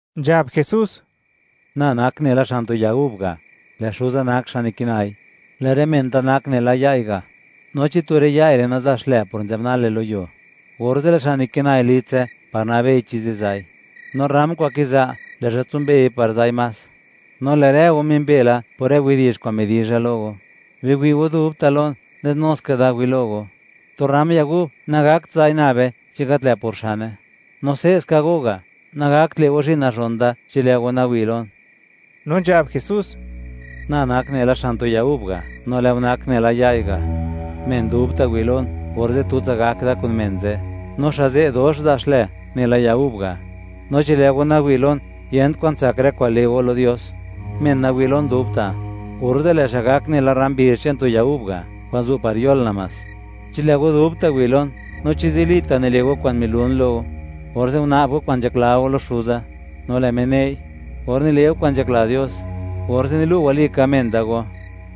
Nzhab Jesús: ―Na nak nela xan tu ya gub ga', lë' Xuza nak xa' nikinai. Lë' rë men da nak nela ya'i ga'. No chi tu rë ya'i re' naza' xlë por nzë'b nale lo yuo, orze' lë' xa' nikinai litse par nabei chi ziza'i; no rram kwa'n kiza', lë' xa' tsimbei par za'i más. No lë' rë go mimbe la por rë widi'zh kwa'n midizha lo go. Biwi' go dubta' lon, nes nuska da wi' lo go. Tu rram ya gub nagakt za'i nabe chi gat lë' por xane. No se'ska go, nagakt le' go zhi'n nazhon da chi lë' go nawi' lon. No nzhab Jesús: ―Na nak nela xan tu ya gub ga', no lë' go nak nela ya'i ga'. Men dubta' wi' lon, orze' tutsa gak da kun men ze', no xa' ze' dox za' xlë, nela ya gub ga'; no chi lë' go nawi' lon, yent kwan tsak rë kwa'n le' go lo Dios. Men nawi' lon dubta', orze' lë' xa' gak nela rram bizh che'n tu ya gub ga' kwa'n zu' par yol namás. ’Chi lë' go dubta' wi' go lon, no chi zilita' nile' go kwa'n milun lo go; orze' una'b go kwa'n nzhakla go lo Xuza, no lë' Me ne'i. Or nile' go kwa'n nzhakla Dios, orze' nilu' walika men da go,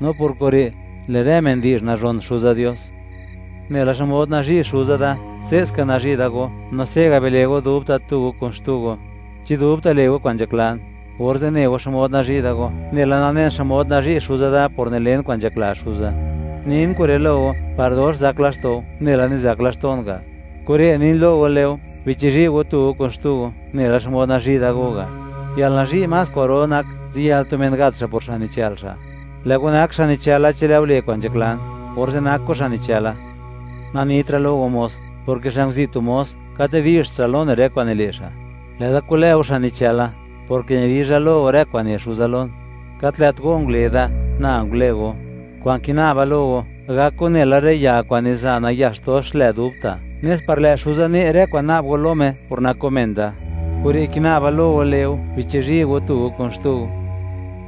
no por kure', lë' rë men di'zh nazhon Xuza Dios. Nela xmod nazhi' Xuza da, se'ska nazhi' da go; no se' ga', bile' go dubta' tu go kun xtu go. Chi dubta' le' go kwa'n nzhaklan, orze' ne go xmod nazhi' da go, nela nanen xmod nazhi' Xuza da por nilen kwa'n nzhakla Xuza. ’Nin kure' lo go par dox zak laxto' go, nela nizak laxto'n ga'. Kure' nin lo go le' go: Bichizhi' go tu go kun xtu go, nela xmod nazhi' da go ga'. Yalnazhi' más kwa'ro nak, ziyël tu men gat xa' por xa' nichë'l xa'. Lë' go nak xa' nichëla chi lë' go le' kwa'n nzhaklan, orze' nak go xa' nichëla. Nanitra' lo go mos, porke xa' nguzi' tu mos, gat nidi'zht xa' lo ne' rë kwa'n nile' xa'. Lë'da kulë go, xa' nichëla, porke nidizha lo go, rë kwa'n ne Xuza lon. Gat lë't go ngule da; na ngule go; kwa'n kina'ba lo go, gak go nela rë ya kwa'n niza' nayax dox xlë dubta', nes par lë' Xuza, ne' rë nak kwa'n na'b go lo Me, por nak go men da. Kure' kina'ba lo go le' go: Bichizhi' go tu go kun xtu go.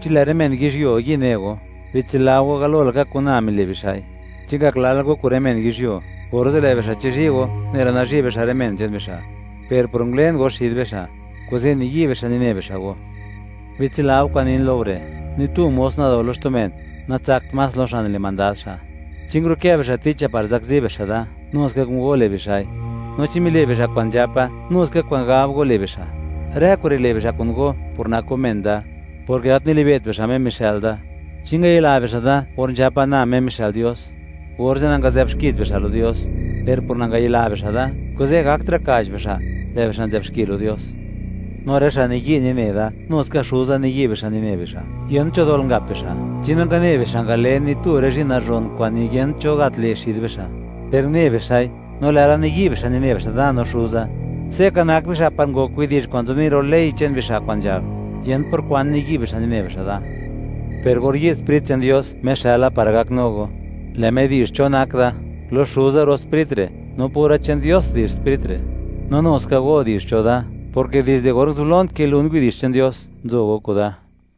’Chi lë' rë men yizhyuo yi' ne go, bitsila go, galo laka kun na mile' bixa'i. Chi ngak lal go kun rë men yizhyuo, orze' lë' bixa' chizhi' go nela nazhi' bixa' rë men che'n bixa'. Per por ngulen go xid bixa', kuze' niyi' bixa' nine bixa' go. Bitsila go kwa'n nin lo go re': “Ni tu mos nado lo xtu men, natsakt más lo xa' nile' mandad xa'.” Chi ngurukë bixa' ticha par zakzi bixa' da, nu ska kun go le' bixa'i; no chi mile' bixa' kwa'n nzhapa, nu ska kwa'n gab go le' bixa'. Rë kure' le' bixa' kun go, por nak go men da, porke gat nilibe't bixa', Me mixë'l da. ’Chi ngayila bixa' da or nzhapa, na Me mixë'l Dios, orze' nangazë'bxkit bixa' lo Dios. Per por nangayila bixa' da, kuze', gaktra' ka'ch bixa', lë' bixa' nzë'b xki lo Dios; no rë xa' niyi' nine da, nu ska Xuza niyi' bixa' nine bixa'. Yent cho dol ngap bixa' chi nangane bixa' ngalen ni tu rë zhi'n nazhon kwa'n niyent cho gat le' xid bixa'. Per une bixa'i, no lë'la niyi' bixa' nine bixa' da no Xuza. Se' ka nak bixa' par ngok widi'zh kwa'n nzobni' lo ley che'n bixa' kwa'n nzhab: “Yent por kwan niyi' bixa' nine bixa' da.” Per or yi'd Sprit che'n Dios, Me xëla par gaknu go, lë' Me di'zh cho nak da. Lo Xuza ro' Sprit re', no pura che'n Dios di'zh Sprit re'. No nu ska go di'zh cho da, porke dizde or nguzublon kilun widi'zh che'n Dios, nzo go kuda.